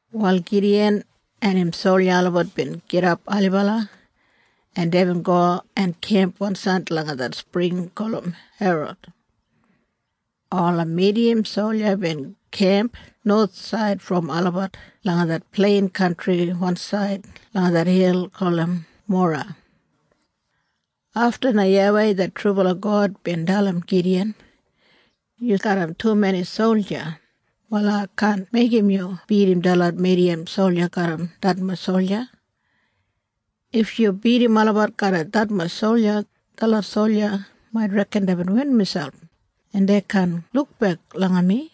Wal Gidiyan en im solja olabat bin gidap ailibala, en deibin go en kemp wansaid langa det spring gulum Herod. Ola Midiyan solja bin kemp nowathsaid brom olabat langa det plein kantri wansaid langa det hil gulum Mora. Afta na YAWEI det trubala God bin dalim Gidiyan, “Yu garram tumeni solja. Wal ai kaan meigim yu bidim detlot Midiyan solja garram detmatj solja. If yu bidim olabat garram detmatj solja, detlot solja mait reken deibin win miselp, en dei kaan lukbek langa mi.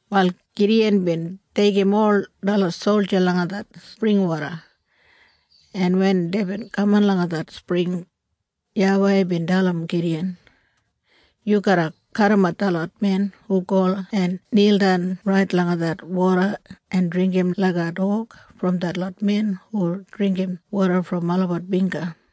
Wal Gidiyan bin deigim ol detlot solja langa det springwoda. En wen deibin kamat langa det spring, YAWEI bin dalim Gidiyan, “Yu garra kadimat detlot men hu go en nildan rait langa det woda en dringgim laiga dog brom detlot men hu dringgim woda brom olabat bingga.”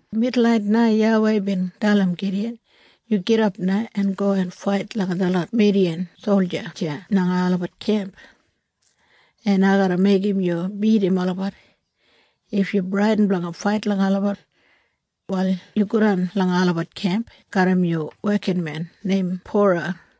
Midulnait na YAWEI bin dalim Gidiyan, “Yu gidap na en go en fait langa detlot Midiyan solja deya langa olabat kemp, en ai garra meigim yu bidim olabat. If yu bradin blanga fait langa olabat, wal yu godan langa olabat kemp garram yu wekinmen neim Pura,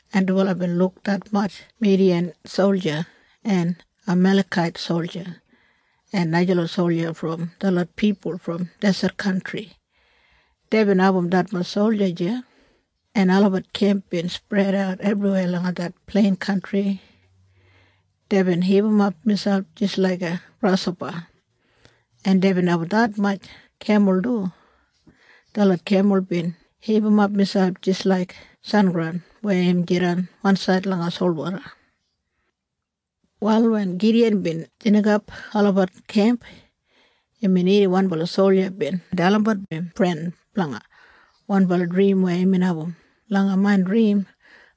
en dubala bin luk detmatj Midiyan solja en Amalekait solja en najalot solja brom detlot pipul brom deset kantri. Deibin abum detmatj solja deya, en olabat kemp bin spredat ebriweya langa det plein kantri. Deibin hipimap miselp jis laiga grashopa, en deibin abum detmatj kemul du. Detlot kemul bin hipimap miselp jis laik sengraun weya im jidan wansaid langa solwoda. Wal wen Gidiyan bin snikap olabat kemp, imbin irrim wanbala solja bin dalimbat im fren blanga wanbala drim weya imbin abum, “Langa main drim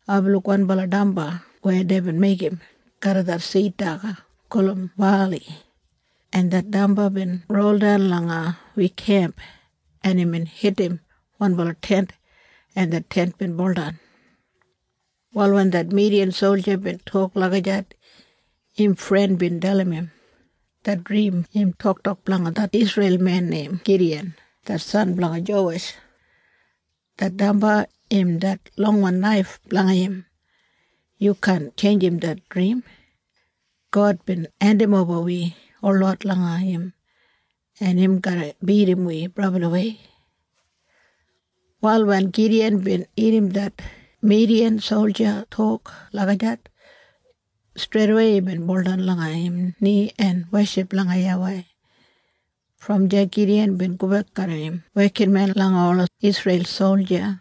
aibin luk wanbala damba weya deibin meigim garram det sid daga gulum bali, en det damba bin roldan langa wi kemp, en imbin hitim wanbala tent, en det tent bin buldan.” Wal wen det Midiyan solja bin tok lagijat, im fren bin dalim im, “Det drim im toktok blanga det Isreil men neim Gidiyan det san blanga Jowesh. Det damba im det longwan naif blanga im. Yu kaan tjeinjim det drim. God bin hendimoba wi holot langa im, en im garra bidim wi brabliwei.” Wal wen Gidiyan bin irrim det Midiyan solja tok lagijat, streidawei imbin baudan langa im ni en weship langa YAWEI. Brom deya Gidiyan bin gobek garram im wekinmen langa ola Isreil solja,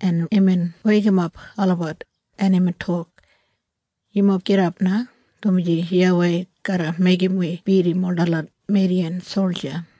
en imbin weikimap olabat, en imbin tok, “Yumob gidap na, dumaji YAWEI garra meigim wi bidim ol detlot Midiyan solja.”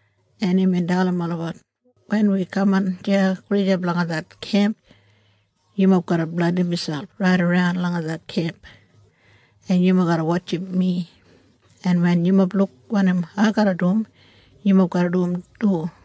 en imbin dalim olabat, “Wen wi kamat deya gulijap langa det kemp, yumob garra blandim miselp raidaran langa det kemp, en yumob garra wotjim mi, en wen yumob luk wanim ai garra dum, yumob garra dum du.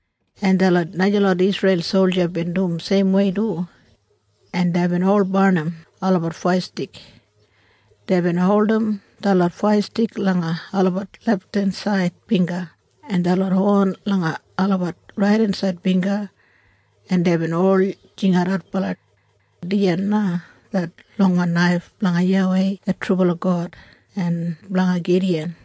en detlot najalot Isreil solja bin dum seimwei du, en deibin ol barnim olabat faiyastik. Deibin holdim detlot faiyastik langa olabat lefthensaid bingga en detlot hon langa olabat raidensaid bingga, en deibin ol jingat adbala, “Dijan na det longwan naif blanga YAWEI det trubala God en blanga Gidiyan!”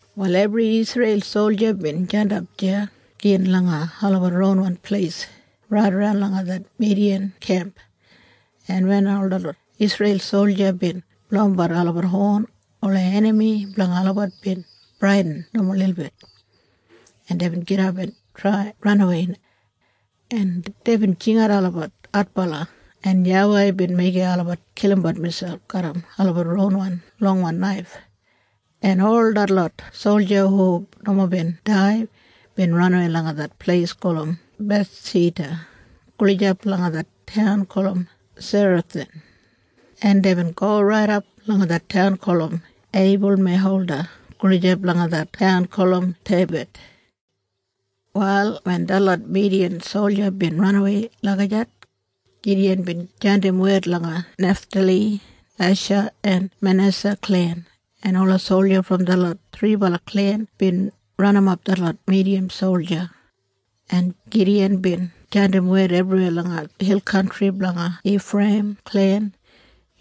Wal ebri Isreil solja bin jandap deya gin langa olabat ronwan pleis raidaran langa det Midiyan kemp, en wen ol detlot Isreil solja bin blowimbat olabat hon, ola enami blanga olabat bin bradin nomo lilbit, en deibin gidap en trai ranawei, en deibin jingatbat adbala, en YAWEI bin meigim olabat kilimbat miselp garram olabat ronwan longwan naif, en ol detlot solja hu nomo bin dai bin ranawei langa det pleis gulum Bethshita gulijap langa det taun gulum Serathan, en deibin go raidap langa det taun gulum Eibulmehola gulijap langa det taun gulum Tebath. Wal wen detlot Midiyan solja bin ranawei lagijat, Gidiyan bin jandim wed langa Neftali, Esha en Manesa klen, en ola solja brom detlot thribala klen bin ranimap detlot Midiyan solja, en Gidiyan bin jandim wed ebriweya langa hil kantri blanga Ifreiyim klen,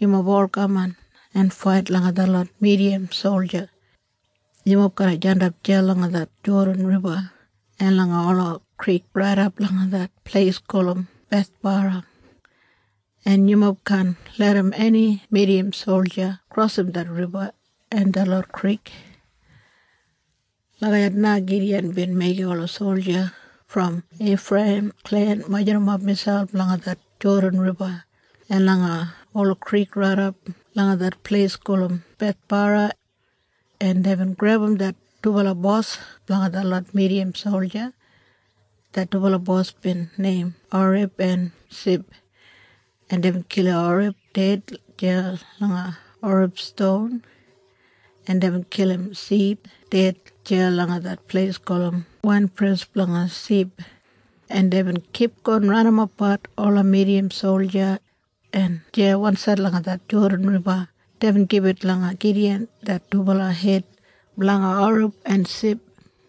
“Yumob ol kaman en fait langa detlot Midiyan solja. Yumob garra jandap deya langa det Jodan Riba en langa ola krik raidap langa det pleis gulum Bethbara, en yumob kaan larram eni Midiyan solja krosim det riba en detlot krik.” Lagijat na Gidiyan bin meigim ola solja brom Ifreiyim klen majurrumap miselp langa det Jodan Riba en langa ola krik raidap langa det pleis gulum Bethbara, en deibin grebum det dubala bos blanga detlot Midiyan solja. Det dubala bos bin neim Oreb en Sib, en deibin kilim Oreb ded deya langa Oreb Ston, en deibin kilim Sib ded deya langa det pleis gulum Wainpres Blanga Sib, en deibin kipgon ranimapbat ola Midiyan solja, en deya wansaid langa det Jodan Riba deibin gibit langa Gidiyan det dubala hed blanga Oreb en Sib.